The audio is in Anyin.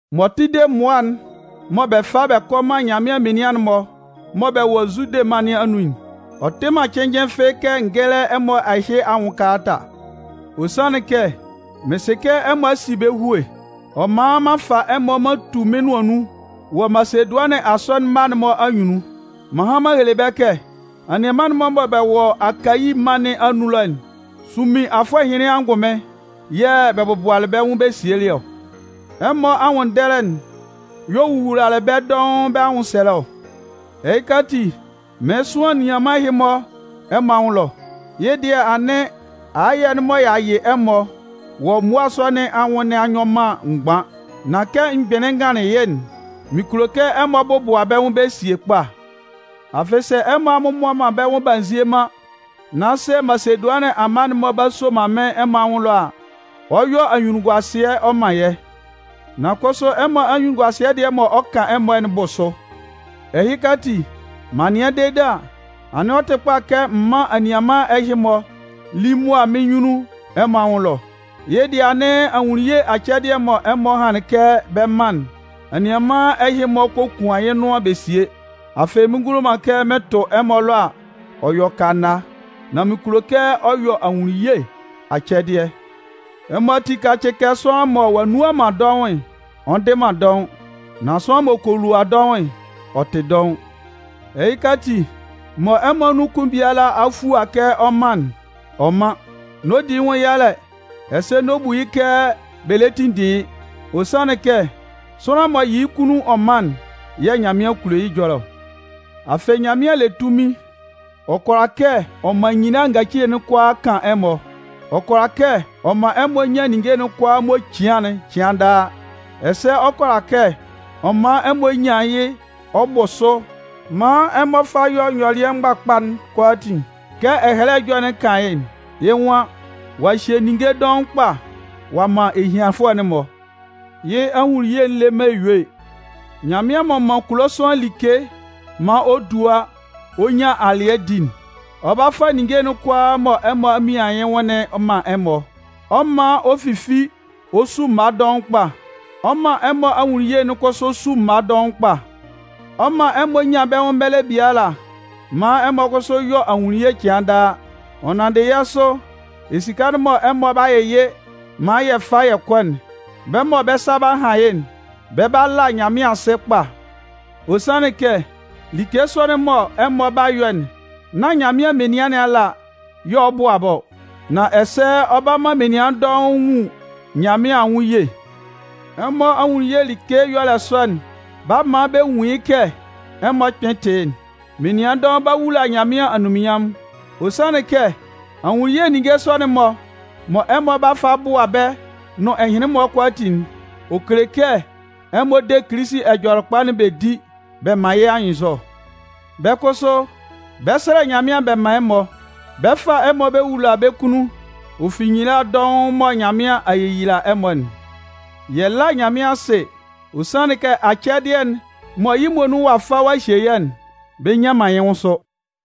M'ɔ tʋ de mmʋa'n mɔ bɛ 'fa bɛ kɔ man Nyanmɩan menian'n-mɔ mɔ bɛ wɔ Zude mân nɩn anun'n, ɔ tɩ man cɩnnjɩn fɩ́ɩ́ kɛ n gɛ́lɛ ɛmɔ ɛhɩ anwʋn kalata. Ɔ sanlɩn kɛ mɩn sɩ kɛ ɛmɔ a si bɛ́ hue, ɔ man m'an fa ɛmɔ m'an tu mɩ́n nʋan nun wɔ Masedʋanɩn asɔnɩn mma'n-mɔ anyunnun. M'an han m'an hele bɛ́ kɛ: “Anianman'n-mɔ mɔ bɛ wɔ Akayi mân nɩn anun ɛlɔ'n, sunmin afʋɛ ɛhɩnlɩn angʋnmɩn yɛ̂ bɛ bɔbʋalɩ bɛ́ nwʋn bɛ sielɩ ɔ.” Ɛmɔ anwʋnndɛlɛ'n y'ɔ wowulalɩ bɛ́ dɔʋn bɛ́ anwʋnsɛlɛ ɔ. Ɛhɩka ati, mɩɩn sʋan anianman ɛhɩ-mɔ ɛmɔ anwʋn ɛlɔ. Yɩ́ dɩɛ anɩn, ayɛ'n mɔ y'a yɩ ɛmɔ wɔ mmʋa sɔ nɩn anwʋn nɩn a nyɔ man mgban. Nan kɛ m gbɩnlɩn n ganlɩn yɩ́'n, mɩn kulo kɛ ɛmɔ bɔbʋa bɛ́ nwʋn bɛ sie sakpa. Afɩ, sɛ ɛmɔ a mmɔbʋa man bɛ́ nwʋn b'a nzie man, nan sɛ Masedʋanɩn amma'n-mɔ b'a soman mɩ́n ɛmɔ anwʋn ɛlɔ a, ɔ 'yɔ anyunnunguasɩɛ ɔ man yɛ́. Nan kʋsʋ ɛmɔ anyunnunguasɩɛ dɩɛ mɔ ɔ 'kan ɛmɔ'n 'bʋ sʋ. Ɛhɩka ati, m'an nɩan dede a, anɩn ɔ tɩ kpa kɛ m mán anianman ɛhɩ-mɔ lí mʋa mɩ́n nyunnun ɛmɔ anwʋn ɛlɔ. Yɩ́ dɩɛ anɩn, ahunnunye acɛdɩɛ'n mɔ ɛmɔ hanlɩn kɛ bɛ 'man'n, anianman ɛhɩ-mɔ kokuan yɩ́ nʋan bɛ sie. Afɩ mɩn ngulo man kɛ mɩn tʋ ɛmɔ ɛlɔ a, ɔ yɔ kana. Nan mɩn kulo kɛ ɔ yɔ ahunnunye acɛdɩɛ. Ɛmɔ ati kácɩ kɛ sʋanlan mɔ ɔ'a nnua man dɔʋn'n, ɔ ndɩ man dɔʋn. Nan sʋanlan m'ɔ kɔ lua dɔʋn'n, ɔ 'tɩ dɔʋn. Ɛhɩka ati, mɔ ɛmɔ anun kʋn biala a fua kɛ ɔ 'man'n, ɔ mán. N'ɔ di yɩ́ nwʋn yalɛ, ɛsɛ n'ɔ bu yɩ́ kɛ bɛ lɛ tinndin yɩ́. Ɔ sanlɩn kɛ sʋanlan m'ɔ yɩ yɩ́ kunnun ɔ man'n yɛ̂ Nyanmɩan kulo yɩ́ ɛjɔlɛ ɔ. Afɩ, Nyanmɩan le tunmin ɔ kʋala kɛ ɔ man nyila ngacile'n kʋalaa kan ɛmɔ. Ɔ kʋala kɛ ɔ man ɛmɔ nyan ninnge'n kʋalaa mɔ cian'n cɩan daa. Ɛsɛ ɔ kʋala kɛ ɔ man ɛmɔ nyan yɩ́ ɔ bʋ sʋ maan ɛmɔ fa bɛ yɔ nyɔlɩɛ mgbakpa'n kʋalaatin kɛ Ɛhɛlɛ Ɛjɔlɛ'n kan yɩ́'n. Yɩ́ nwan: Ɔ'a hye ninnge dɔʋn kpa ɔ'a man ehianfʋɛ'n-mɔ. Yɩ́ ahunnunye'n le man eyue. Nyanmɩan m'ɔ man kulo sʋanlan like maan ɔ dua ɔ nyan alɩɛ di'n, ɔ 'ba fa ninnge'n kʋalaa mɔ ɛmɔ a mian yɩ́ nwʋn'n man ɛmɔ, ɔ 'man ɔ fifi ɔ su mma dɔʋn kpa. Ɔ 'man ɛmɔ ahunnunye'n kʋsʋ su mma dɔʋn kpa. Ɔ 'man ɛmɔ nyan bɛ́ nwʋn mɛlɛ biala maan ɛmɔ kʋsʋ yɔ ahunnunye cɩan daa. Ɔ nanndɩ yɛ́ sʋ, esika'n mɔ ɛmɔ 'ba yɩyɩ maan yɛ fa yɛ kɔ'n, bɛ́ mɔ bɛ́ sa 'ba han yɩ́'n, bɛ 'ba la Nyanmɩan asɩ kpa. Ɔ sanlɩn kɛ like sɔ'n mɔ ɛmɔ 'ba yɔ'n, nán Nyanmɩan menian nɩn ala y'ɔ 'ba bʋa bɛ́ ɔ, nan ɛsɛ ɔ 'ba man menian dɔʋn nwun Nyanmɩan anwʋn ye. Ɛmɔ ahunnunye like ɛyɔlɛ sɔ'n 'ba man bɛ nwun yɩ́ kɛ ɛmɔ kpɩn tɩ yɩ́'n. Menian dɔʋn 'ba wula Nyanmɩan anunminnyanmʋn. Ɔ sanlɩn kɛ ahunnunye ninnge sɔ'n-mɔ mɔ ɛmɔ 'ba fa bʋa bɛ́ nʋn ɛhɩnlɩn-mɔ kʋalaatin'n, ɔ kele kɛ ɛmɔ de Kilisi Ɛjɔlɛkpa'n bɛ di bɛ man yɩ́ anyɩnnzɔ. Bɛ́ kʋsʋ, bɛ 'sɛlɛ Nyanmɩan bɛ man ɛmɔ. Bɛ 'fa ɛmɔ bɛ wula bɛ́ kunnun, ɔ fi nyila dɔʋn mɔ Nyanmɩan a yeyila ɛmɔ'n. Yɛ lá Nyanmɩan asɩ. Ɔ sanlɩn kɛ acɛdɩɛ'n mɔ yɩ́ muonun ɔ'a fa ɔ'a hye yɛ́'n, bɛ nnyan man yɩ́ nwʋn sʋ!